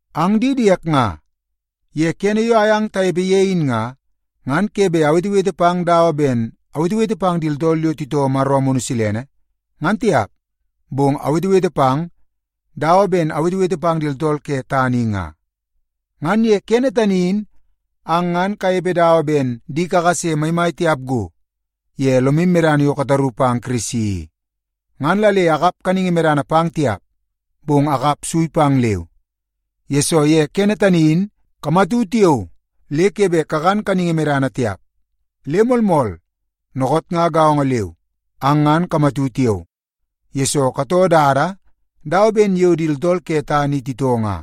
Ang di diek nga, ye kene yo ayang tanepe ye in nga, ngan ke bet awetewete pang dawa ben awetewete pang di tooltool yo titoo Maro Amunu Silene, ngan tiap, bong awetewete pang dawa ben awetewete pang di tooltool ke tana i nga. Ngan ye kene tani in ang ngan kanepe dawa ben di kakase maimai tiap go ye lomu medana yo kataru pang Kirisi i. Ngan la le akap kaningi medana pang tiap, bong akap sui pang leu, yesoo ye kene tani in kamatu tiao le ke bet kakan kaningi yo medana, ngan tiap. Le moolmool, dookoot nga gaongo leu, ang ngan kamatu tiao, yesoo katoo dada dawa ben yo di tooltool ke tana i titoo nga.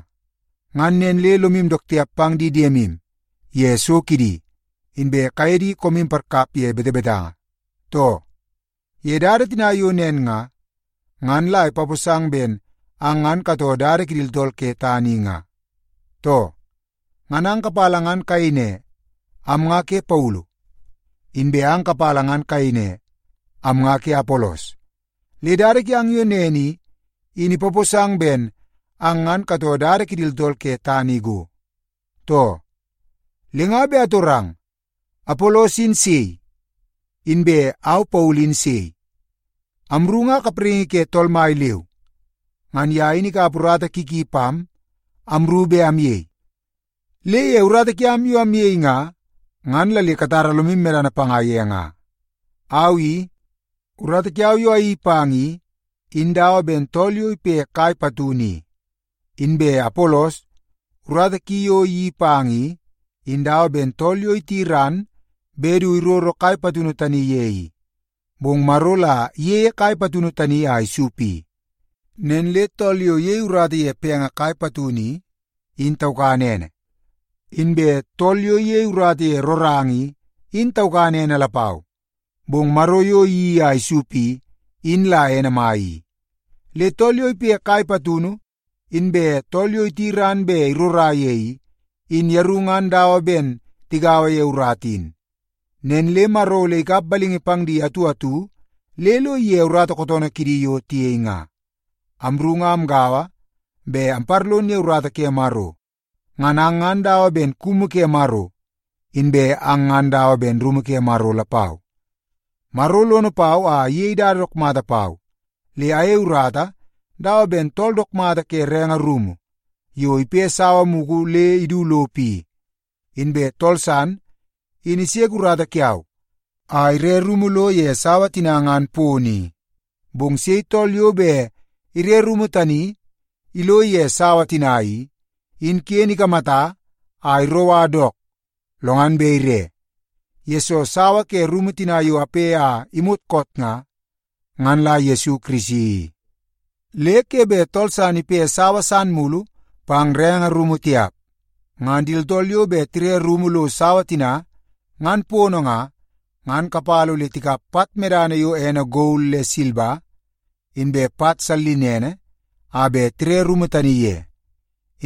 Ngan nen le lomu dook tiap pang di diemu ye so kidi, inbe kaye di koomu parkap ye betebetanga, too? Ye dada tina yo nen nga, ngan la ipaposang ben ang ngan katoo dada kidi tooltool ke tana i nga, too? Ngan ang kapala ngan kayei ne, “Am nga ke Paulu,” inbe ang kapala ngan kayei ne, “Am nga ke Apolos.” Le dada kiang yo nen i, in ipaposang ben ang ngan katoo dada kidi tooltool ke tana i go, too? Le nga bet atorang, Apolos in sei? Inbe au Paulu in sei? Amru nga kapraingi ke Tool Mai leu. Ngan ye in ikap urata ki ki pam amru bet amyei. Le ye urata kiam yo amyei nga, ngan la le katara lomu medana panga ye nga. Au i, urata kiau yo ayeii pang i, in dawa ben tool yo ipe kai patunu i. Inbe Apolos, urata ki yo iyeii pang i, in dawa ben tool yo iti ran bet du iroro kai patunu tani ye i. Bong Maro la iyeie kai patunu tani a isup i. Nen le tool yo iyei urata ye penge kai patunu i, in taukan ene. Inbe tool yo iyei urata ye roranga i, in taukan ene lapau. Bong Maro yo iyeii a isup i, in la ene mai i. Le tool yo ipe kai patunu, inbe tool yo iti ran bet irora ye i, in yeru ngan dawa ben tigaua ye urata in. Nen le Maro ole ikap balingi pang di atu atu le lo ige urata kootoonoo kidi yo tiyei nga. Amru nga amgaua bet amparlon ye urata ke Maro. Ngan ang ngan dawa ben kumu ke Maro, inbe ang ngan dawa ben rumu ke Maro lapau. Maro lono pau a iyei dada dook mata pau le ayei urata dawa ben tool dook mata ke renge rumu yo ipe sawa mugu le idu lopo i. Inbe tool san in iseke urata kiau a ire rumu lo ye sawa tina ngan pono i. Bong sei tool yo bet ire rumu tani ilo ye sawa tina i, in ken ikamata a iroua dook lo ngan bet ire, yesoo sawa ke rumu tina yo ape a imot koot nga, ngan la Yesu Kirisi i. Le ke bet tool san ipe sawa san mulu pang renge rumu tiap. Ngan di tooltool yo bet tire rumu lo sawa tina ngan pono nga, ngan kapala ole tikap pat medana yo ene gol le silba, inbe pat sallinene a bet tire rumu tani ye.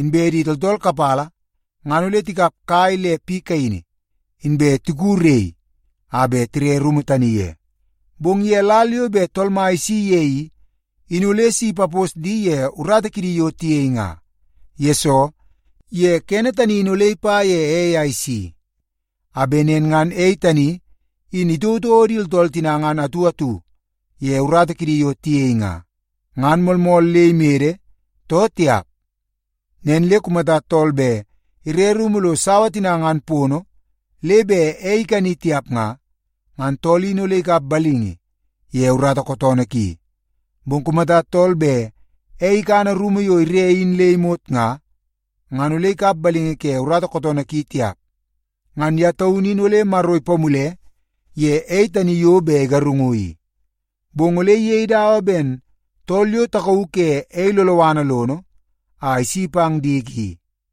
Inbe di tooltool kapala ngan ole tikap kai le piu kaini, inbe tiku rei a bet tire rumu tani ye. Bong ye lal yo bet Tool Mai isi ye i, in ole si ipapos di ye urata kidi yo tiyei nga. Yesoo, ye kene tani in ole ipa ye ei a isi, a bet nen ngan ei tani in itouotouo di tooltool tina ngan atu atu ye urata kidi yo tiyei nga, ngan moolmool le imede, too tiap. Nen le kumata tool bet ire rumu lo sawa tina ngan pono le bet ei ikani tiap nga, ngan tool in ole ikap balingi ye urata kootoonoo ki. Bong kumata tool bet ei ikana rumu yo ire in le imot nga, ngan ole ikap balingi ye urata kootoonoo ki tiap. Ngan ye taunu in ole Maro ipamule ye ei tani yo bet igarungu i, bong ole iyei dawa ben tool yo takauu ke ei loloana lono a isi pang diki i.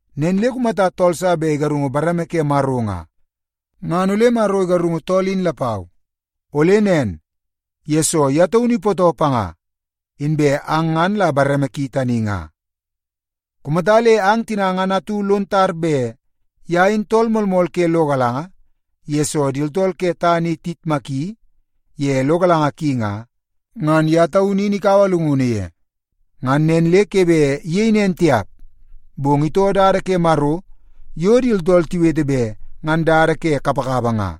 Nen le kumata tool sa bet igarungu bareme ke Maro nga, ngan ole Maro igarungu tool in lapau. Ole nen, yesoo ye taunu ipootoo panga, inbe ang ngan la bareme ki tani nga. Kumata le ang tina ngan atu lon tar bet ye in tool moolmool ke lo galanga yesoo di tooltool ke tana i tiyitmaki ye lo galanga ki nga, ngan ye taunu in ikaua llungunu ye. Ngan nen le ke bet iyei nen tiap, bong itoo dada ke Maro yo di tooltool tiwete bet ngan dada ke kapakapa nga,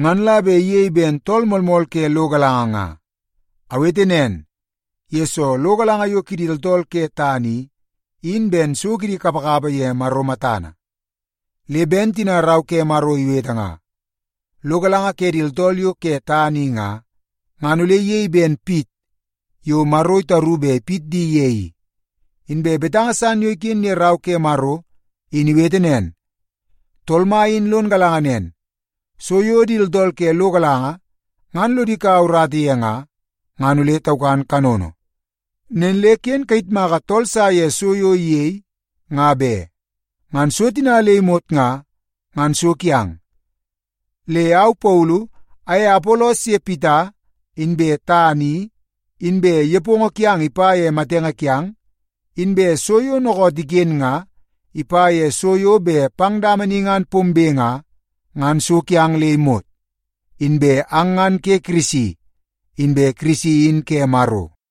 ngan la bet iyei ben tool moolmool ke lo galanga nga. Awete nen, yesoo lo galanga yo kidi tooltool ke tana i, in ben so kidi kapakapa ye Maro matana. Le ben tina Rau ke Maro iwete nga, “Lo galanga ke di tooltool yo ke tana i nga, ngan ole iyei ben pit yo Maro itaru bet ipit di ye i.” Inbe betanga san yo iken ye Rau ke Maro in iwete nen, “Tool Mai in lon galanga nen, so yo di tooltool ke lo galanga ngan lodi kaua urata ye nga, ngan ole taukan kanono.” Nen le ken kayitmaka tool sa ye so yo iyei, nga be. Ngan so tina le imot nga, ngan so kiang. Le au Paulu aye Apolos ye Pita, inbe tana i, inbe nepongo kiang ipa ye matenge kiang, inbe so yo dookoot iken nga, ipa ye so yo bet pang dama ni ngan pombe nga, ngan so kiang le imot. Inbe ang ngan ke Kirisi, inbe Kirisi in ke Maro.